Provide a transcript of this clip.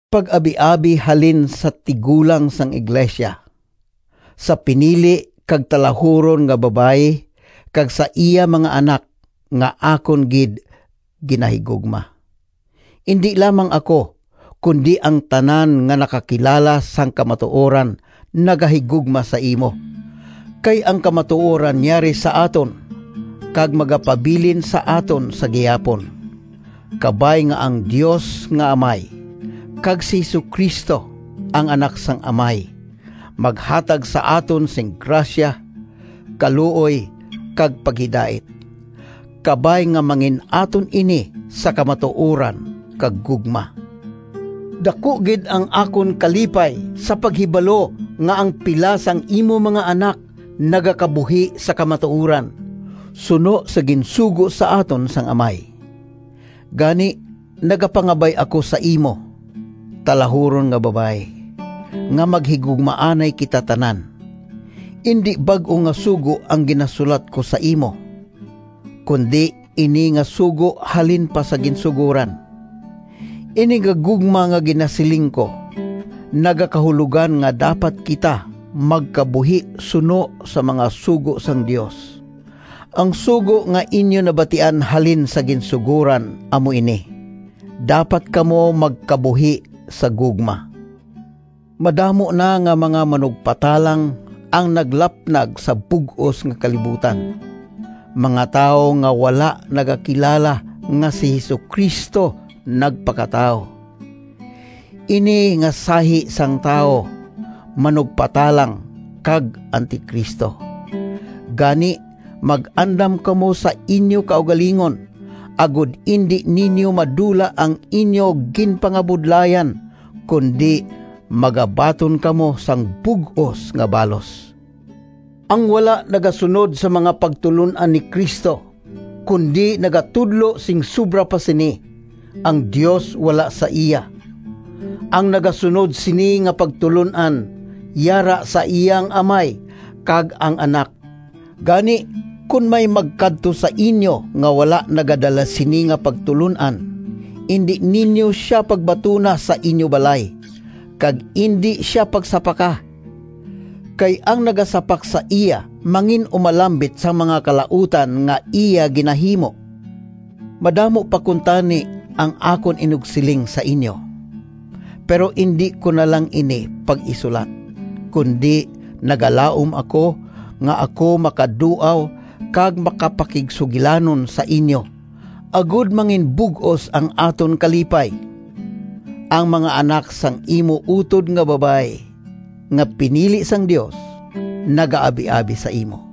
Pag-abiabi halin sa Tigulang sang iglesia— Sa pinili kag talahuron nga Babayi kag sa iya mga anak, nga akon gid ginahigugma. Indi lamang ako, kundi ang tanan nga nakakilala sang kamatuoran nagahigugma sa imo, kay ang kamatuoran yari sa aton kag magapabilin sa aton sa gihapon. Kabay nga ang Dios nga Amay kag si Jesu-Cristo, ang Anak sang Amay, maghatag sa aton sing grasya, kaluoy kag paghidait. Kabay nga mangin-aton ini sa kamatuoran kag gugma. Daku gid ang akon kalipay sa paghibalo nga ang pila sang imo mga anak nagakabuhi sa kamatuoran, suno sa ginsugo sa aton sang Amay. Gani, nagapangabay ako sa imo, talahuron nga Babayi, nga maghigugmaanay kita tanan. Indi bag-o nga sugo ang ginasulat ko sa imo, kundi ini nga sugo halin pa sa ginsugoran. Ini nga gugma nga ginasiling ko, nagakahulogan nga dapat kita magkabuhi suno sa mga sugo sang Dios. Ang sugo nga inyo nabatian halin sa ginsugoran amo ini: dapat kamo magkabuhi sa gugma. Madamo na nga mga manugpatalang ang naglapnag sa bug-os nga kalibutan, mga tawo nga wala nagakilala nga si Jesu-Cristo nagpakatawo. Ini nga sahi sang tawo manugpatalang kag Anti-Cristo. Gani mag-andam kamo sa inyo kaugalingon, agod indi ninyo madula ang inyo ginpangabudlayan, kundi magabaton kamo sang bug-os nga balos. Ang wala nagasunod sang mga pagtulon-an ni Cristo, kundi nagatudlo sing sobra pa sini, ang Dios wala sa iya. Ang nagasunod sini nga pagtulon-an, yara sa iya ang Amay kag ang Anak. Gani, kon may magkadto sa inyo nga wala nagadala sini nga pagtulon-an indi ninyo sia pagbatuna sa inyo balay, kag indi sia pagsapaka. Kay ang nagasapak sa iya mangin-umalambit sang mga kalautan nga iya ginahimo. Madamo pa kuntani ang akon inugsiling sa inyo, pero indi ko na lang ini pag-isulat, kundi nagalaom ako nga ako makaduaw kag makapakigsugilanon sa inyo agod manginbug-os ang aton kalipay. Ang mga anak sang imo utod nga Babayi nga pinili sang Dios, nagaabiabi sa imo.